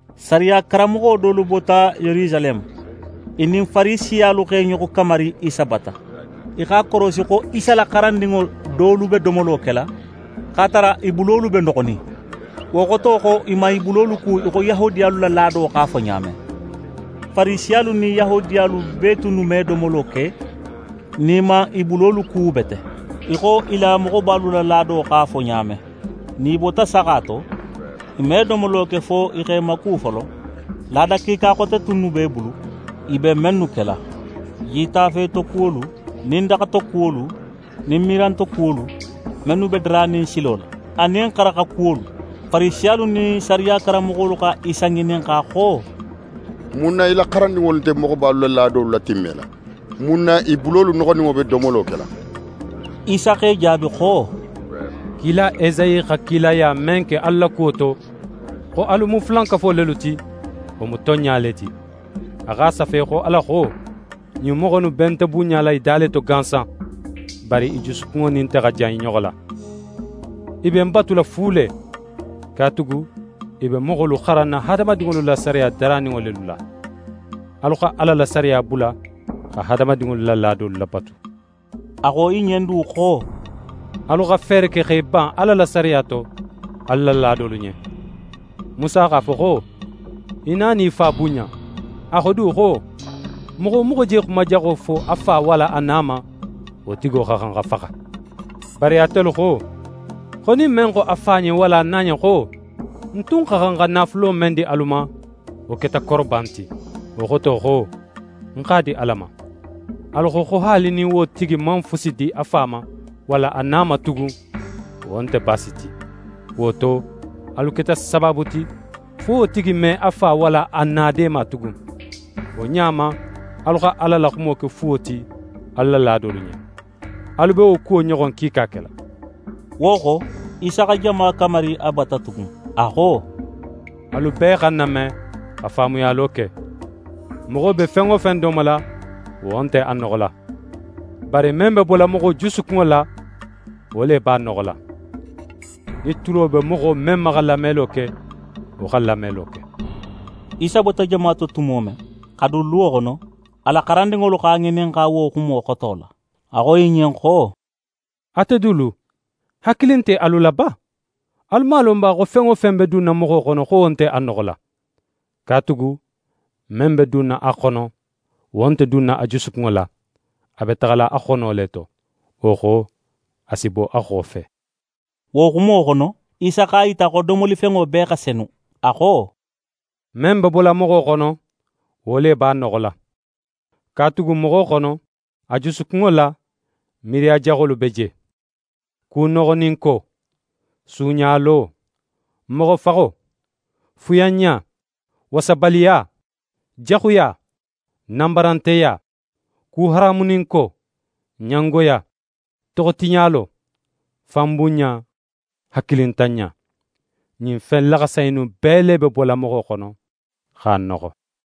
Sariya karanmoxo dolu bota Yerusaleme, i nin Farisiyalu x'e ɲoxo kamari Isa bata. I x'a korosi, xo Isa la xarandinŋo dolu be domolo kela, x'a tara, i bulolu be noxonin, wo xoto, xo i man i bulolu ku í xo Yahudiyalu la laado x'a fo ɲa men. Farisiyalu nin Yahudiyalu bee tunnu me domolo ke nin i man i bulolu ku bete, í xo i la moxobalu la laado x'a fo ɲa men. Nin i bota saxa to, i me domolo ke, fo i x'e maku folo. Laada kiika xote tunnu b'e bulu i be mennu kela: Jitafe tokuwolu nin daxa tokuwolu nin mirantokuwolu, mennu be daranin silo la, anin xaraxa kuwolu. Farisiyalu nin sariya karanmoxolu xa Isa ŋininxa xo: «Mun na í la xarandinŋolu nte moxobalu la laadolu latimmela? Mun na i bulolu noxoninŋo be domolo kela?» Isa x'e jaabi xo: «Kila Esayi xa kilaya men ke alu la kuwo to, xo alu mu fulankafo lelu ti, wo mu tonɲa le ti. A x'a safe xo Ala xo: “Ɲin moxo innu be nte bunɲala i da le to gansan, bari i jusukunŋo nin nte xa jan i ɲoxo la. I be ń batula fu le. Katugu i be moxolu xaranna hadamadinŋolu la sariya daraninŋo lelu la.” Alu xa Ala la sariya bula xa hadamadinŋolu la laadolu labatu.» A xo i ɲen du xo: «Alu xa feere ke x'e ban Ala la sariya to, alu la laadolu ɲen. Musa x'a fo xo: “Í na nin í fa bunɲa.” A xo du xo: “Moxo wo moxo je xuma jaxo fo a fa walla a na ma, wo tigo xa xan xa faxa.” Bari atelu xo, xo nin men xo a fa ɲen walla a na ɲen xo: “Ń tun xa xan xa naafulo men di alu ma, wo keta koroban ti. Wo xoto: Ń x'a di Ala ma.” Alu xo, haali nin wo tigi man fusi di a fa ma, walla a na ma tugun, wo nte baasi ti. Wo to, alu keta sabaabu ti, fo wo tigi me a fa walla a na deema tugun. Wo ɲa ma, alu xa Ala la xumo ke fuwo ti alu la laadolu ɲen. Alu be wo kuwo ɲoxon kiika kela.» Wo xo, Isa xa jama kamari a bata tugun. A xo: «Alu bee xa ń name, xa faamuyalo ke. Moxo be fen wo fen domola, wo nte a noxola, bari men be bola moxo jusukunŋo la, wo le b'a noxola. [ Nin tulo be moxo men ma xa lamelo ke, wo xa lamelo ke!]» Isa bota jama to tumo men, xa dun luwo xono, a la xarandinŋolu x'a ŋininxa wo xumo xoto la. A xo i ɲen xo: «Ate dulu, hakili nte alu la ba? Alu man a lon ba, xo fen wo fen be dunna moxo xono, xo wo nte a noxola? Katugu men be dunna a xono, wo nte dunna a jusukunŋo la; a be taxala a xono le to, wo xo, a si bo a xofe.» Wo xumo xono, Isa x'a yita, xo domolifenŋo bee xa senu. A xo: «Men be bola moxo xono, wo le b'a noxola. Katugu moxo xono, a jusukunŋo la, miiriya jaxolu be je: Kunoxoninko, suuɲalo, moxofaxo, fuyanɲa, wasabaliya, jaxuya, nanbaranteya, kuharamuninko, ɲangoya, toxotiɲalo, fanbunɲa, hakilintanɲa. Ɲin fen laxasa innu bee le be bola moxo xono, x'a noxo.»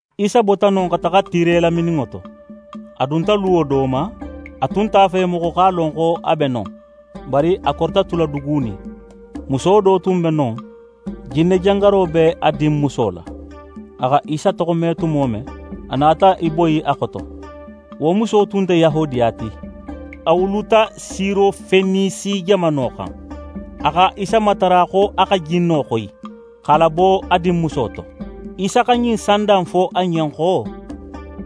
Isa bota non, xa taxa Tire lamininŋo to. A dunta luwo do ma; a tun nte a fe moxo x'a lon xo a be non. Bari a korita tula dugunin. Muso do tun be non, jinne jangaro be a dinmuso la. A xa Isa toxo me tumo men, a nata í boyi a xoto. Wo muso tun nte Yahudiya ti; a wuluta Sirofenisi jamano xan. A xa Isa matara xo a xa jinno xoyi, x'a labo a dinmuso to. Isa xa ɲin sanda in fo a ɲen xo: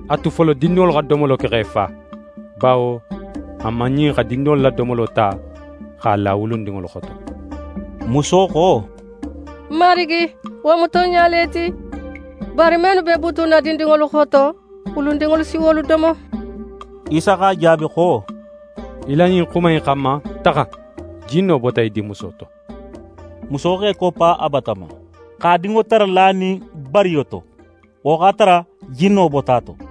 «A tu folo, dindinŋolu xa domolo ke x'e fa; bawo a man ɲin xa dindinŋolu la domolo ta, x'a la wulundinŋolu xoto.» Muso xo: «Marigi, wo mu tonɲa le ti, bari mennu be butunna dindinŋolu xoto, wulundinŋolu si wolu domo.» Isa x'a jaabi xo: «Í la ɲin xuma in xanma, taxa: Jinno bota í dinmuso to.» Muso x'é koppa a bata ma, x'a dinŋo tara lanin bariyo to: Wo x'a tara jinno bota a to.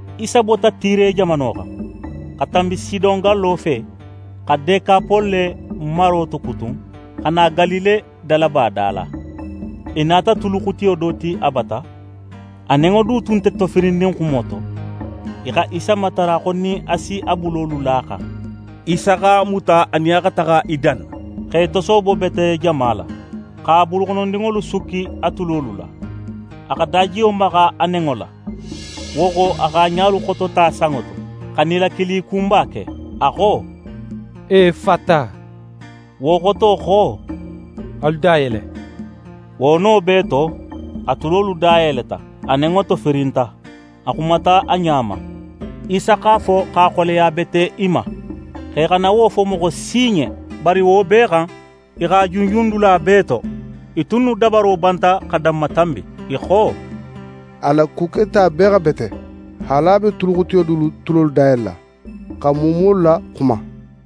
Isa bota Tire jamano xan, xa tanbi Sidon gallo fe, xa Dekapole maro tokutun, xa na Galile dalaba da la. I nata tuluxutiyo do ti a bata; a nenŋo du tun nte tofirinnin xumo to. I xa Isa matara xo nin a si a bulolu la a xan. Isa x'a muta, a nin a xa taxa i danna, x'e tosoobo bete jama la, x'a buluxonondinŋolu sukki a tulolu la. A xa dajiyo maxa a nenŋo la, wo xo, a x'a ɲalu xotota sanŋo to, xa nilakili kunba ke. A xo: «Efata.» Wo xoto xo: «Alu dayele.» Wo no bee to, a tulolu dayeleta; a nenŋo tofirinta, a xumata a ɲa ma. Isa x'a fo, x'a xoleya bete i ma, xo i xana wo fo moxo si ɲen. Bari wo bee xan, i x'a junjun dula bee to. I tunnu dabaro banta fo xa danmatanbi. I xo: «A la ku keta bee xa bete; haali a be tuluxutiyo dulu tulolu dayelela, xa muumuwolu laxuma.»